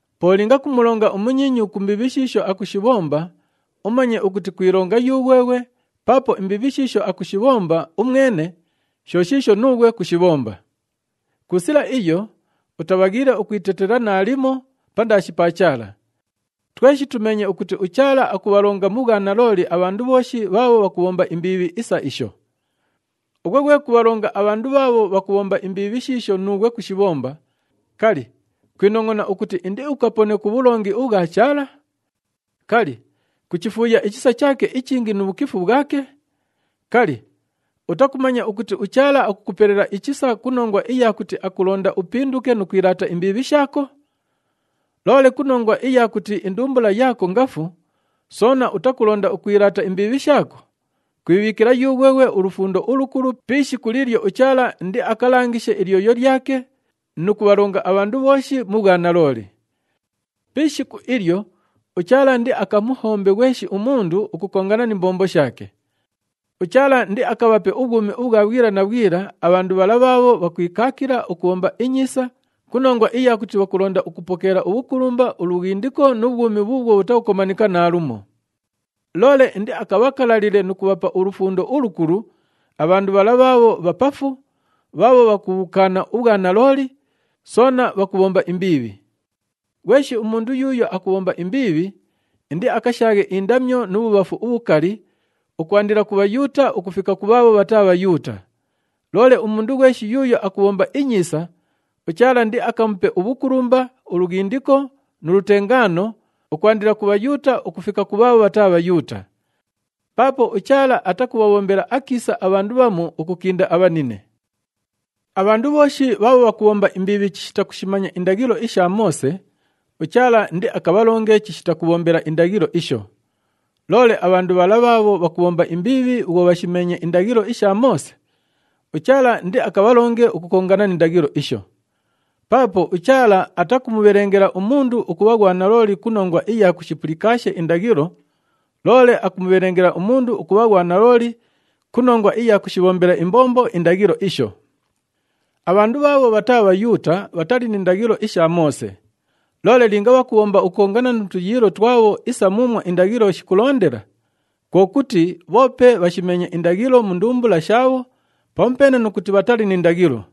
Po linga kumulonga umunyiinyu ku mbiibhi shiisho akushibhomba, umanye ukuti kwilonga yughweghwe paapo imbiibhi shiisho akushibhomba umwene sho shiisho nuughwe kushibhomba. Ku sila iyo, utabhaghiile ukwitetela naalimo pandaashi pa Chaala. Tweshi tumeenye ukuti uChaala akubhalonga mu bhwanalooli abhandu bhooshi bhaabho bhakubhomba imbiibhi isa isho. Ughwe ghwe kubhalonga abhandu bhaabho bhakubhomba imbiibhi shiisho nuughwe kushibhomba, kali, kwinongʼona ukuti indiukapone ku bhulongi ubhwa Chaala? Kali, kuchifuuya ichisa chaake ichingi nu bhukifu bhwake? Kali, utakumanya ukuti uChaala akukupelela ichisa ku nongwa iya kuti akulonda upinduke nu kwilaata imbiibhi shaako? Loole ku nongwa iya kuti indumbula yaako ngafu, soona utakulonda ukwilaata imbiibhi shaako, kwibhiikila yughweghwe ulufundo ulukulu pi ishiku liilyo uChaala indiakalangishe ilyoyo lyake nu kubhalonga abhandu bhooshi mu bhwanalooli. Pi ishiku ilyo, uChaala indiakamuhombe ghweshi umundu ukukongana ni mbombo shaake. UChaala indiakabhape ubhwumi ubhwa bhwila na bhwila abhandu bhala bhaabho bhakwikaakila ukubhomba inyiisa ku nongwa iya kuti bhakulonda ukupokeela ubhukulumba, ulughindiko nu bhwumi bhuubhwo bhutakukomanika naalumo. Loole indiakabhakalalile nu kubhapa ulufundo ulukulu abhandu bhala bhaabho bhapafu, bhaabho bhakubhukaana ubhwanalooli, soona bhakubhomba imbiibhi. Ghweshi umundu yuuyo akubhomba imbiibhi, indiakashaaghe indamyo nu bhubhafu ubhukali, ukwandila ku Bhayuuta ukufika ku bhaabho bhataa Bhayuuta. Loole umundu ghweshi yuuyo akubhomba inyiisa, uChaala indiakamupe ubhukulumba, ulughindiko nu lutengaano, ukwandila ku Bhayuuta ukufika ku bhaabho bhataa Bhayuuta. Paapo uChaala atakubhabhombela akiisa abhandu bhamu ukukinda abhanine. Abhandu bhooshi bhaabho bhakubhomba imbiibhi chishita kushimanya indaghilo isha Moose, uChaala indiakabhalonge chishita kubhombela indaghilo isho. Loole abhandu bhala bhaabho bhakubhomba imbiibhi bhwo bhashimeenye indaghilo isha Moose, uChaala indiakabhalonge ukukongana ni ndaghilo isho. Paapo uChaala atakumubhelengela umundu ukubha ghwanalooli ku nongwa iya kushipulikaashe indaghilo, loole akumubhelengela umundu ukubha ghwanalooli ku nongwa iya kushibhombela imbombo indaghilo isho. Abhandu bhaabho bhataa Bhayuuta bhatali ni ndaghilo isha Moose. Loole linga bhakubhomba ukukongana nu tuyiilo twabho isa muumwo indaghilo shikulondela, kwo kuti bhoope bhashimeenye indaghilo mu ndumbula shaabho pamupeene nu kuti bhatali ni ndaghilo.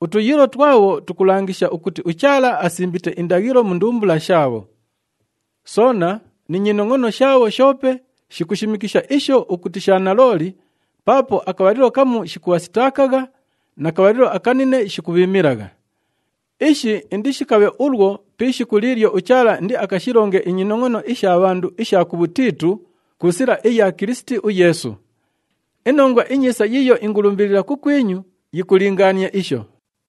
Utuyiilo twabho tukulangisha ukuti uChaala asimbite indaghilo mu ndumbula shaabho. Soona ni nyinongʼono shaabho shoope shikushimikisha isho ukuti sha nalooli paapo akabhalilo kamu shikubhasitaakagha na kabhalilo akanine shikubhiimilagha. Ishi indishikabhe ulwo pi ishiku liilyo uChaala indiakashilonge inyinongʼono isha bhandu isha kubhutiitu ku sila iya Kilisiti uYeesu. INongwa iNyiisa yiiyo ingulumbilila kukwinyu yikulingaania isho.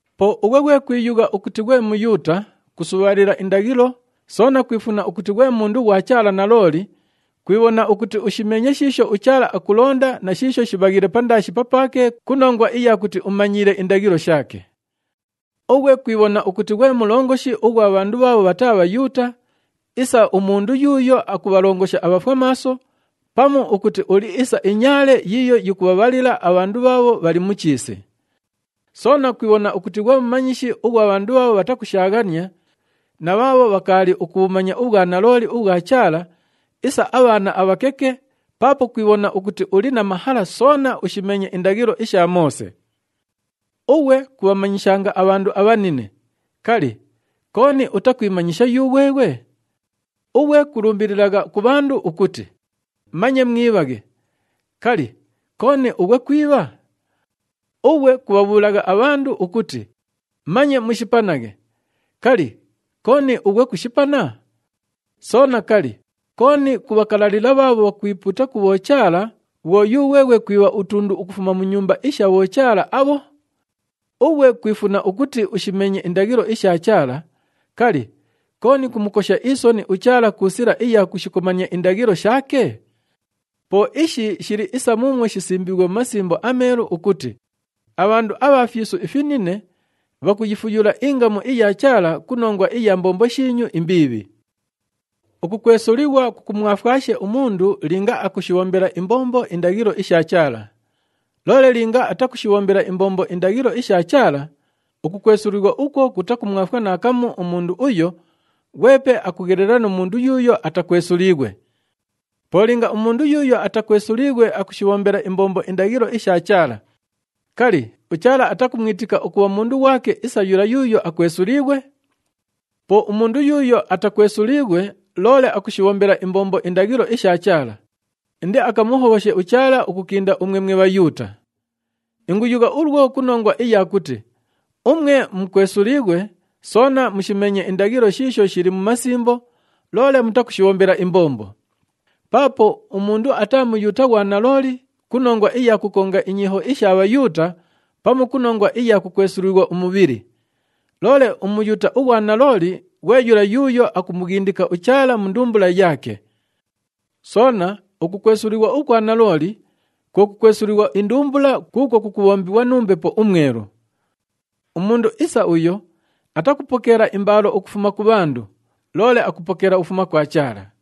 Po ughwe ghwe kwiyugha ukuti ghwe Muyuuta, kusubhaalila indaghilo, soona kwifuna ukuti ghwe mundu ghwa Chaala nalooli, kwibhona ukuti ushimeenye shiisho uChaala akulonda na shiisho shibhaghiile pandaashi papaake ku nongwa iya kuti umanyiile indaghilo shaake. Ughwe kwibhona ukuti ghwe mulongoshi ughwa bhandu bhaabho bhataa Bhayuuta isa umundu yuuyo akubhalongosha abhafwamaaso pamu ukuti uli isa inyaale yiiyo yikubhabhalila abhandu bhaabho bhali mu chiisi. Soona kwibhona ukuti ghwe mumanyishi ughwa bhandu bhaabho bhatakushaaghania na bhaabho bhakaali ukubhumanya ubhwanalooli ubhwa Chaala isa abhaana abhakeke paapo kwibhona ukuti uli na mahala soona ushimeenye indaghilo isha Moose. Ughwe kubhamanyishanga abhandu abhanine, kali, kooni utakwimanyisha yughweghwe? Ughwe kulumbililagha ku bhandu ukuti, “Manye mwibhaghe,” kali, kooni ughwe kwibha? Ughwe kubhabhuulagha abhandu ukuti, “Manye mushipanaghe,” kali, kooni ughwe kushipana? Soona, kali, kooni kubhakalalila bhaabho bhakwipuuta ku bhochaala bhwo yughweghwe kwibha utundu ukufuma mu nyumba isha bhochaala abho? Ughwe kwifuna ukuti ushimeenye indaghilo isha Chaala, kali, kooni kumukosha isoni uChaala ku sila iya kushikomania indaghilo shaake? Po ishi shili isa muumwo shisimbiighwe mu Masimbo aMeelu ukuti, “Abhandu abha fyisu ifinine, bhakuyifuyula ingamu iya Chaala ku nongwa iya mbombo shiinyu imbiibhi.” Ukukwesulighwa kukumwafwashe umundu linga akushibhombela imbombo indaghilo isha Chaala. Loole linga atakushibhombela imbombo indaghilo isha Chaala, ukukwesulighwa ukwo kutakumwafwa naakamu umundu uyo, ghwepe akughelela nu mundu yuuyo atakwesuliighwe. Po linga umundu yuuyo atakwesuliighwe akushibhombela imbombo indaghilo isha Chaala, kali, uChaala atakumwitika ukubha mundu ghwake isa yula yuuyo akwesuliighwe? Po umundu yuuyo atakwesuliighwe loole akushibhombela imbombo indaghilo isha Chaala, indiakamuhobhoshe uChaala ukukinda umwe mwe Bhayuuta. Inguyugha ulwo ku nongwa iya kuti umwe mukwesuliighwe soona mushimeenye indaghilo shiisho shili mu masimbo, loole mutakushibhombela imbombo. Paapo umundu ataa Muyuuta ghwa nalooli ku nongwa iya kukonga inyiiho isha Bhayuuta pamu ku nongwa iya kukwesulighwa umubhili. Loole uMuyuuta ughwa nalooli ghwe yula yuuyo akumughindika uChaala mu ndumbula yaake. Soona ukukwesulighwa ukwa nalooli kwo kukwesulighwa indumbula kuukwo kukubhombighwa nu Mbepo uMwelu. Umundu isa uyo atakupokeela imbaalo ukufuma ku bhandu, loole akupokeela ukufuma kwa Chaala.